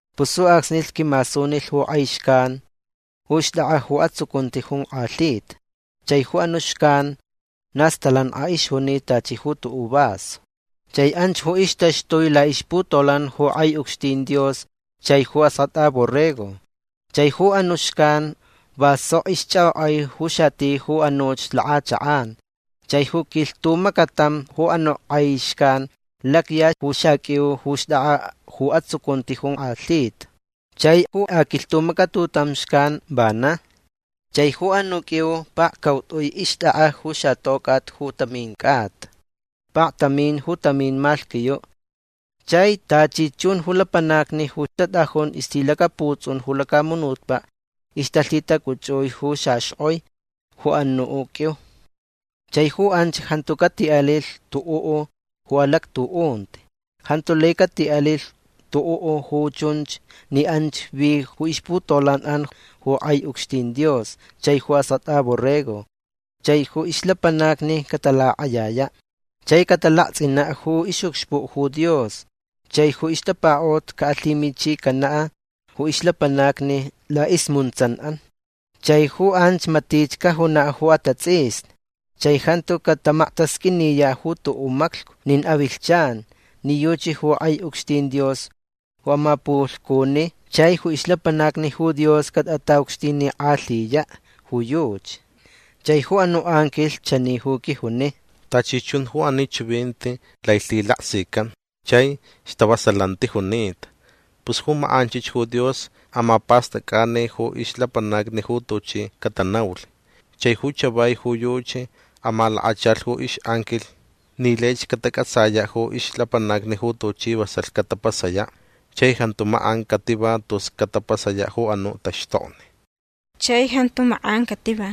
Pus ju acsnich quimasunilh ju k'ai xcan ju xt'ak'a ju atsucunti jonk'alhita. Chai ju anu' xcan na stalank'a ixjunita tachi ju tu'u' vaso. Chai anch ju ixtaxtui la'ixputolan'an ju k'ai ucxtin Dios chai ju Ask'at'a Borrego. Chai ju anu' xcan va sok ixch'ak'ok'ai ju xati ju anuch lak'achak'an. Chai ju quilhtumacatam ju anu' k'ai xcan lacya ju xaq'uiu ju xt'ak'a ju atsucunti jonk'alhita. Chai ju aquilhtumacatutam xcan vana. Chai ju anu' q'uiu pakcaut'ui ixt'ak'a ju xatoc'at ju tamin c'ata. Paktamin ju tamin malhquiyu'. Chai tachi chun ju lapanacni ju tat'ajun ixlhilacaputs'un ju lacamunutpa' ixtalhitac'uch'ui ju xaxk'oi ju anu' q'uiu. Chai ju anch jantu cati'alilh tu'u' ju alactu'unti. Jantu lai cati'alilh tu'u' ju chunch ni anch vi ju ixputolan'an ju k'ai ucxtin Dios chai ju Ask'at'a Borrego. Chai ju ixlapanacni catalak'ayaya'. Chai catalakts'ina' ju ix'ucxpu' ju Dios. Chai ju ixtapaka'ut ca'alhimichicana' ju ixlapanacni la'ismuntsan'an. Chai ju anch matich cajuna' ju atats'isni. Chai jantu catamaktasq'uiniya' ju tu'u' maclhcu nin avilhchan ni yuchi ju k'ai ucxtin Dios ju amapulhcuni. Chai ju ixlapanacni Dios catat'ata'ucxtinik'alhiya' ju yuchi. Chai ju anu' anquilh chani ju quijuni: ―Tachi chun ju ani chivinti lai lhilaksican chai stavasalanti junita. Pus ju mak'anchich ju Dios amapast'ac'ani ju ixlapanacni ju tuchi catanaulh. Chai ju chavai ju yuchi amalakachalh ju ix'anquilh ni laich catac'atsaya' ju ixlapanacni ju tuchi vasalh catapasaya'. Chai jantu mak'an cativa tus catapasaya' ju anu' taxtokni. Chai jantu mak'an cativa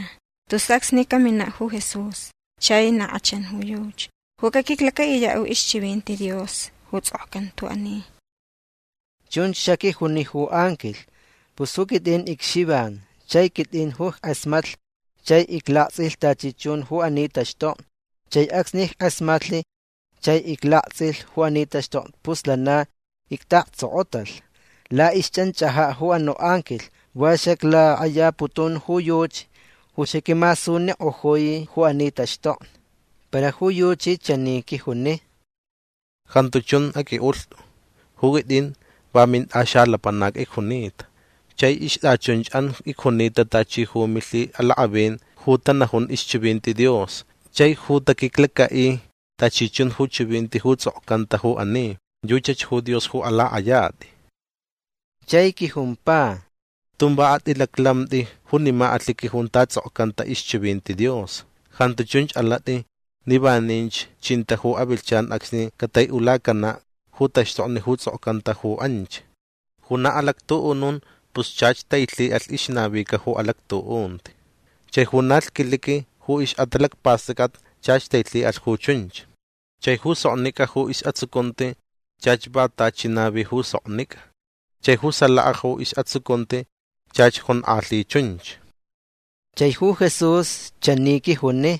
tus acsni camina' ju Jesús. Chai na k'achan ju yuchi ju caquiclaca'iya' ju ixchivinti Dios ju ts'okcanta ju ani. ―Chunch xaquijuni ju anquilh. Pus ju quit'in icXivan chai quit'in ju ick'asmatlh chai iclakts'ilh tachi chun ju ani taxtokni. Chai acsni ick'asmatlh chai iclakts'ilh ju ani taxtokni pus lana icta'aktsokotalh la'ixch'anch'aja' ju anu' anquilh. Va xaclak'ayaputun ju yuchi ju xaquimasunik'ojui ju ani taxtokni. Para ju yuchi chani quijuni: ―Jantu chun aq'ui'ulht'u. Ju quit'in va mint'axalapanac icjunita. Chai ixt'achunch'an icjunita tachi ju milhi'alak'avin ju tanajun ixchivinti Dios chai ju taquiclaca'i tachi chun ju chivinti ju ts'okcanta ju ani. Yuchach ju Dios ju alak'ayat'i. Chai quijumpa: ―Tun va at'ilaclamt'i junima alhiqui junta ts'okcanta ixchivinti Dios. Jantu chunch alat'i ni vaninch chinta ju avilhchan acsni catai'ulacana' ju taxtokni ju ts'okcanta ju anch. Ju na alactu'unun pus chach tailhi'alh ixnavica ju alactu'unti. Chai ju na lhquiliqui ju ix'atalacpast'ac'at chach tailhi'alh ju chunch. Chai ju soknic'a ju is'atsucunti chach va tachi navi ju soknic'a. Chai ju salaka ju is'atsucunti chach jonk'alhi chunch. Chai ju Jesús chani quijuni: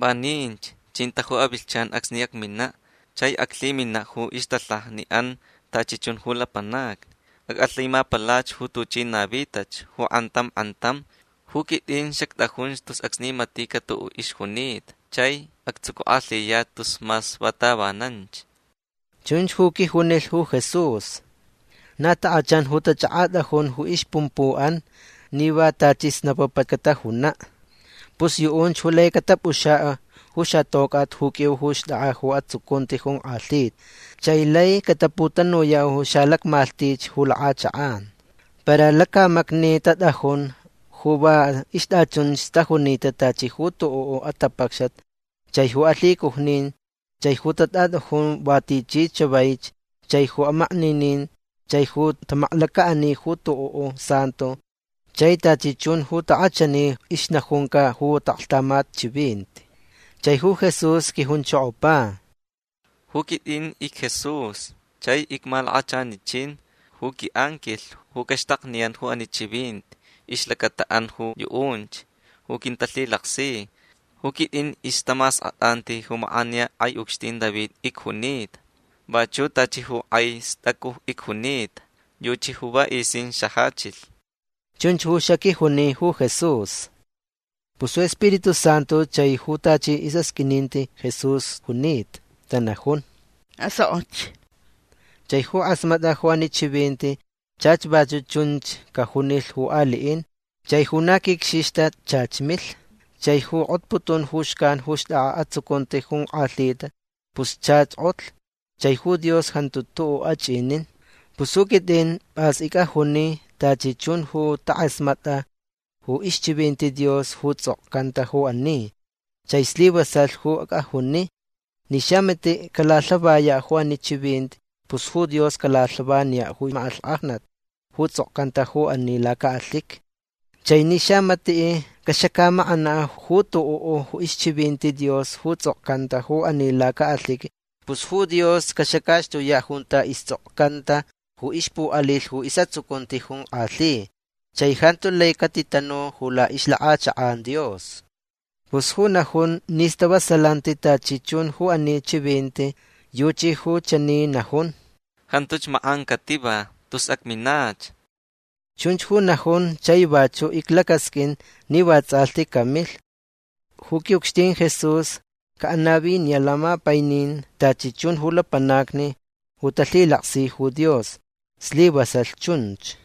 ―Vaninch chinta ju avilhchan acsni acmina' chai aclhimina' ju ixtalhaja'an tachi chun ju lapanacni. Ac'alhimapalach ju tuchi navitach ju k'antam k'antam. Ju quit'in xact'ajun tus acsni matica' tu'u' ixjunita chai actsucuk'alhiyach tus mas va tavananch. ―Chunch ju quijunilh ju Jesús. Na tak'achan ju tach'ak'at'ajun ju ixpumpu'an ni va tachi snapapa catajuna'. Pus yu'unch ju laich catap'uxa' ju xatoc'at ju q'uiu ju xt'ak'a ju atsucunti jonk'alhi. Chai lai cataputanuya' ju xalacmalhtich ju lak'achak'an. Para lacamacni tat'ajun ju va ixt'achunch tajunita tachi ju tu'u' atapacxat chai ju alhicujnin chai ju tat'at'ajun va tichi chavaich chai ju amakninin chai ju tamaklaca'ani ju tu'u' santo chai tachi chun ju tak'achani ixnajunca ju ta'aklhtamat chivinti. Chai ju Jesús quijunchokopa: ―Ju quit'in icJesús chai icmalakachanichin ju qui'anquilh ju caxtakniyan ju ani chivinti ixlacata'an ju yu'unch ju quintalhilaksi. Ju quit'in ixtamask'at'anti mak'aniya k'ai ucxtin David icjunita. Vachu' tachi ju k'ai st'acu icjunita. Yuchi ju vats'isin xajachilh. ―Chunch ju xaquijuni ju Jesús. Pus ju Spiritu Santu chai ju tachi is'asq'uininti Jesús junita tanajun: ―Asok'och. Chai ju k'asmat'a ju anu' chivinti chach vachu' chunch cajunilh ju ali'in. Chai ju na quicxixta chach milh. Chai ju k'otputun ju xcan ju xt'ak'a ju atsucunti jonk'alhita pus chach k'otlh. Chai ju Dios jantu tu'u' ach'inin. Pus ju quit'in p'as ic'ajuni tachi chun ju tak'asmat'a ju ixchivinti Dios ju ts'okcanta ju ani. Chai slivasalh ju ic'ajuni. Ni xamati' calalhavaya' ju ani chivinti pus ju Dios calalhavaniya' ju mak'alhk'ajnat ju ts'okcanta ju ani laca'alhiqui. Chai ni xamati' caxacamak'ana' ju tu'u' ixchivinti Dios ju ts'okcanta ju ani laca'alhiqui pus ju Dios caxacaxtuya' junta ists'okcanta ju ixpu'alilh ju is'atsucunti jonk'alhi chai jantu lai catitanu ju la'ixlak'achak'an Dios. Pus ju najun ni stavasalanti tachi chun ju ani chivinti yuchi ju chani najun: ―Jantuch mak'an cativa tus acminach. Chunch ju najun chai vachu' iclacasq'uin ni vats'alhti camilh. Ju qui'ucxtin Jesús ca'anaviniya' lamapainin tachi chun ju lapanacni ju talhilaksi ju Dios. Slivasalh chunch.